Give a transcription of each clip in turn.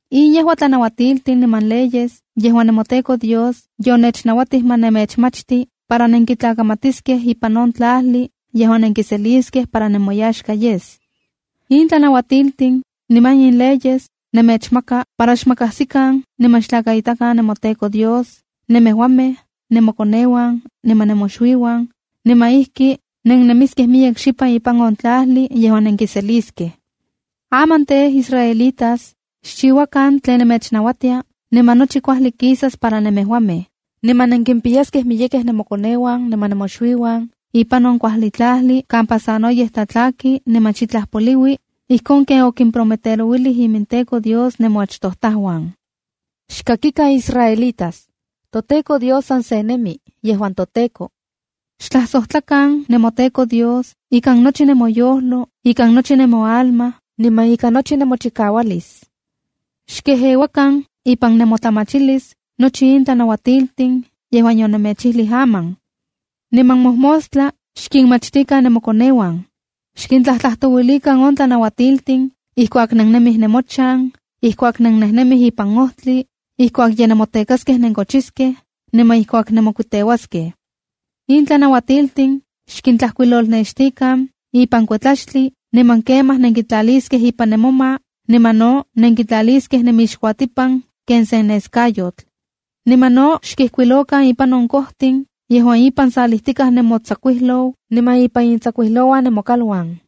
’In yejua tlanauatiltin niman leyes yejuan nemoTEKO Dios yonechnauatij ma nemechmachti para nenkintlakamatiskej ipan on tlajli yejuan nenkiseliskej para nemoyaxka yes. In tlanauatiltin niman in leyes nemechmaka para xmakajsikan niman xtlakaitakan nemoTEKO Dios, nemejuamej, nemokoneuan, niman nemoxuiuan, niman ijki nennemiskej miyek xipan ipan on tlajli yejuan nenkiseliskej. Aman tej israelitas, xchiuakan tlen nemechnauatia, niman nochi kuajli kisas para nemejuamej, niman nenkimpiyaskej miyekej nemokoneuan niman nemoxuiuan ipan on kuajli tlajli kampa sanoyej tlatlaki niman xitlaj poliui, ijkon ken okimprometerouilij iminTEKO Dios nemoachtojtajuan. ’Xkakikan israelitas: ToTEKO Dios san se nemi yejuan toTEKO. ’Xtlajsojtlakan nemoTEKO Dios ikan nochi nemoyojlo, ikan nochi nemoalma, niman ika nochi nemochikaualis. ’Xkejeuakan ipan nemotlamachilis nochi in tlanauatiltin yejuan yonemechijlij aman. Niman mojmostla xkinmachtikan nemokoneuan. Xkintlajtlajtouilikan on tlanauatiltin ijkuak nennemij nemochan, ijkuak nennejnemij ipan ojtli, ijkuak ye nenmotekaskej nenkochiskej niman ijkuak nemokuiteuaskej. In tlanauatiltin xtlajkuilolnextikan ipan kuetlaxtli, niman kemaj nenkitlaliskej ipan nemoma niman no nenkitlaliskej nenmixkuatipan ken sen neskayotl. Niman no xkijkuilokan ipan on kojtin yejuan ipan salijtikaj nemotsakuijlou niman ipan intsakuijlouan nemokaluan.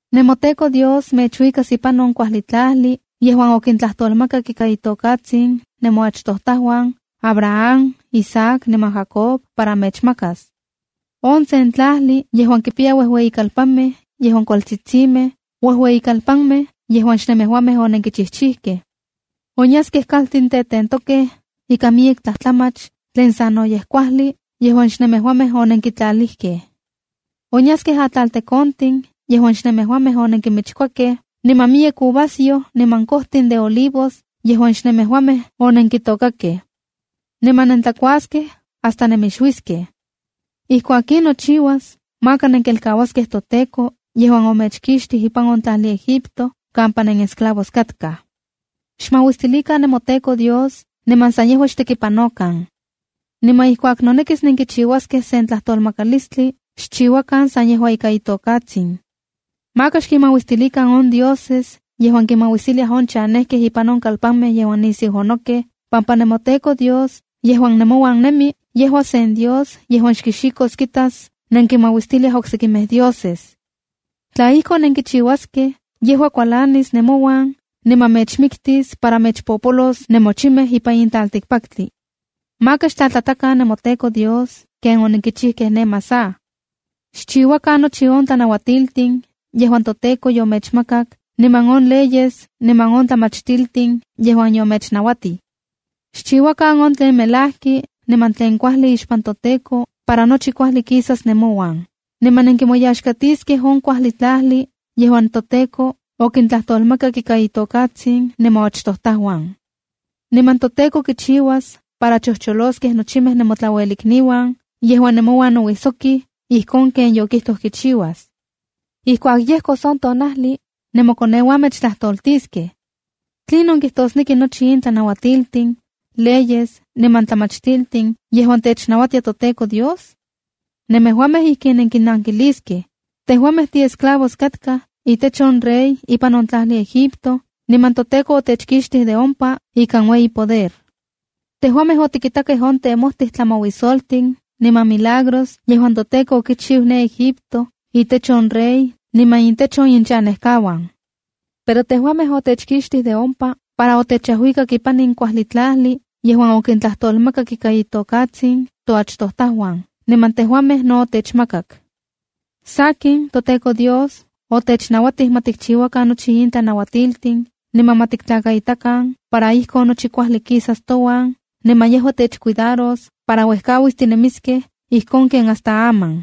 ’NemoTEKO Dios mechuikas ipan on kuajli tlajli yejuan okintlajtolmakak ika itokatsin nemoachtojtajuan Abraham, Isaac, niman Jacob para mechmakas. On sen tlajli yejuan kipiya uejueyikalpanmej yejuan kualtsitsimej, uejueyikalpanmej yejuan xnemejuamej onenkinchijchijkej. Onyaskej kaltin tetentokej ikan miyek tlajtlamach tlen sanoyej kuajli, yejuan xnemejuamej onenkitlalijkej. Onyaskej atlaltekontin yejuan xnemejuamej onenkimichkuakej, niman miyek uvasyoj niman kojtin de olivos yejuan xnemejuamej onenkitôkakej. Niman nentlakuaskej hasta nemixuikej. Ijkuak in nochiuas, maka nenkelkauaskej toTEKO yejuan omechkixtij ipan on tlajli Egipto kampa nenesclavos katkaj. Xmauistilikan nemoTEKO Dios niman san yejua xtekipanokan. Niman ijkuak nonekis nenkichiuaskej sen tlajtolmakalistli xchiuakan san yejua ika itokatsin. Maka xkinmauistilikan on dioses yejuan kinmauistiliaj on chanejkej ipan on kalpanmej yejuan nisiu onokej, pampa nemoTEKO Dios yejuan nemouan nemi, yejua sen Dios yejuan xkixikos kitas nenkinmauistiliaj oksejkimej dioses. Tla ijkon nenkichiuaskej, yejua kualanis nemouan niman mechmiktis para mechpopolos nemochimej ipan in tlaltikpaktli. ’Maka xtlatlatakan nemoTEKO Dios ken onenkichijkej ne Masah. Xchiuakan nochi on tlanauatiltin yejuan toTEKO yomechmakak niman on leyes niman on tlamachtiltin yejuan yomechnauatij. Xchiuakan on tlen melajki, niman tlen kuajli ixpan toTEKO, para nochi kuajli kisas nemouan, niman nenkimoyaxkatiskej on kuajli tlajli yejuan toTEKO okintlajtolmakak ika itokatsin nemoachtojtajuan. Niman toTEKO kichiuas para chojcholoskej nochimej nemotlauelikniuan yejuan nemouan nouijsokij, ijkon ken yokijtoj kichiuas. ’Ijkuak yejkos on tonajli, nemokoneuan mechtlajtoltiskej: “¿Tlinon kijtosneki nochi in tlanauatiltin, leyes, niman tlamachtiltin yejuan technauatia toTEKO Dios?” Nemejuamej ijkin nenkinnankiliskej: “Tejuamej tiesclavos katkaj itech on rey ipan on tlajli Egipto, niman toTEKO otechkixtij de ompa ikan ueyi poder. Tejuamej otikitakej on temojtij tlamauisoltin niman milagros yejuan toTEKO okichiu ne Egipto itech on rey niman intech on ichanejkauan. Pero tejuamej otechkixtij de ompa para otechajuikak ipan in kuajli tlajli yejuan okintlajtolmakak ika itokatsin toachtojtajuan, niman tejuamej no otechmakak. Sakin, toTEKO Dios otechnauatij ma tikchiuakan nochi in tlanauatiltin niman ma tiktlakaitakan para ijkon nochi kuajli kisas touan, niman yejua techcuidaros para uejkauis tinemiskej ijkon ken hasta aman.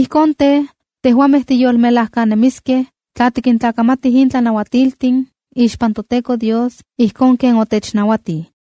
Ijkon tej, tejuamej tiyolmelajkanemiskej tla tikintlakamatij in tlanauatiltin ixpan toTEKO Dios ijkon ken otechnauatij.”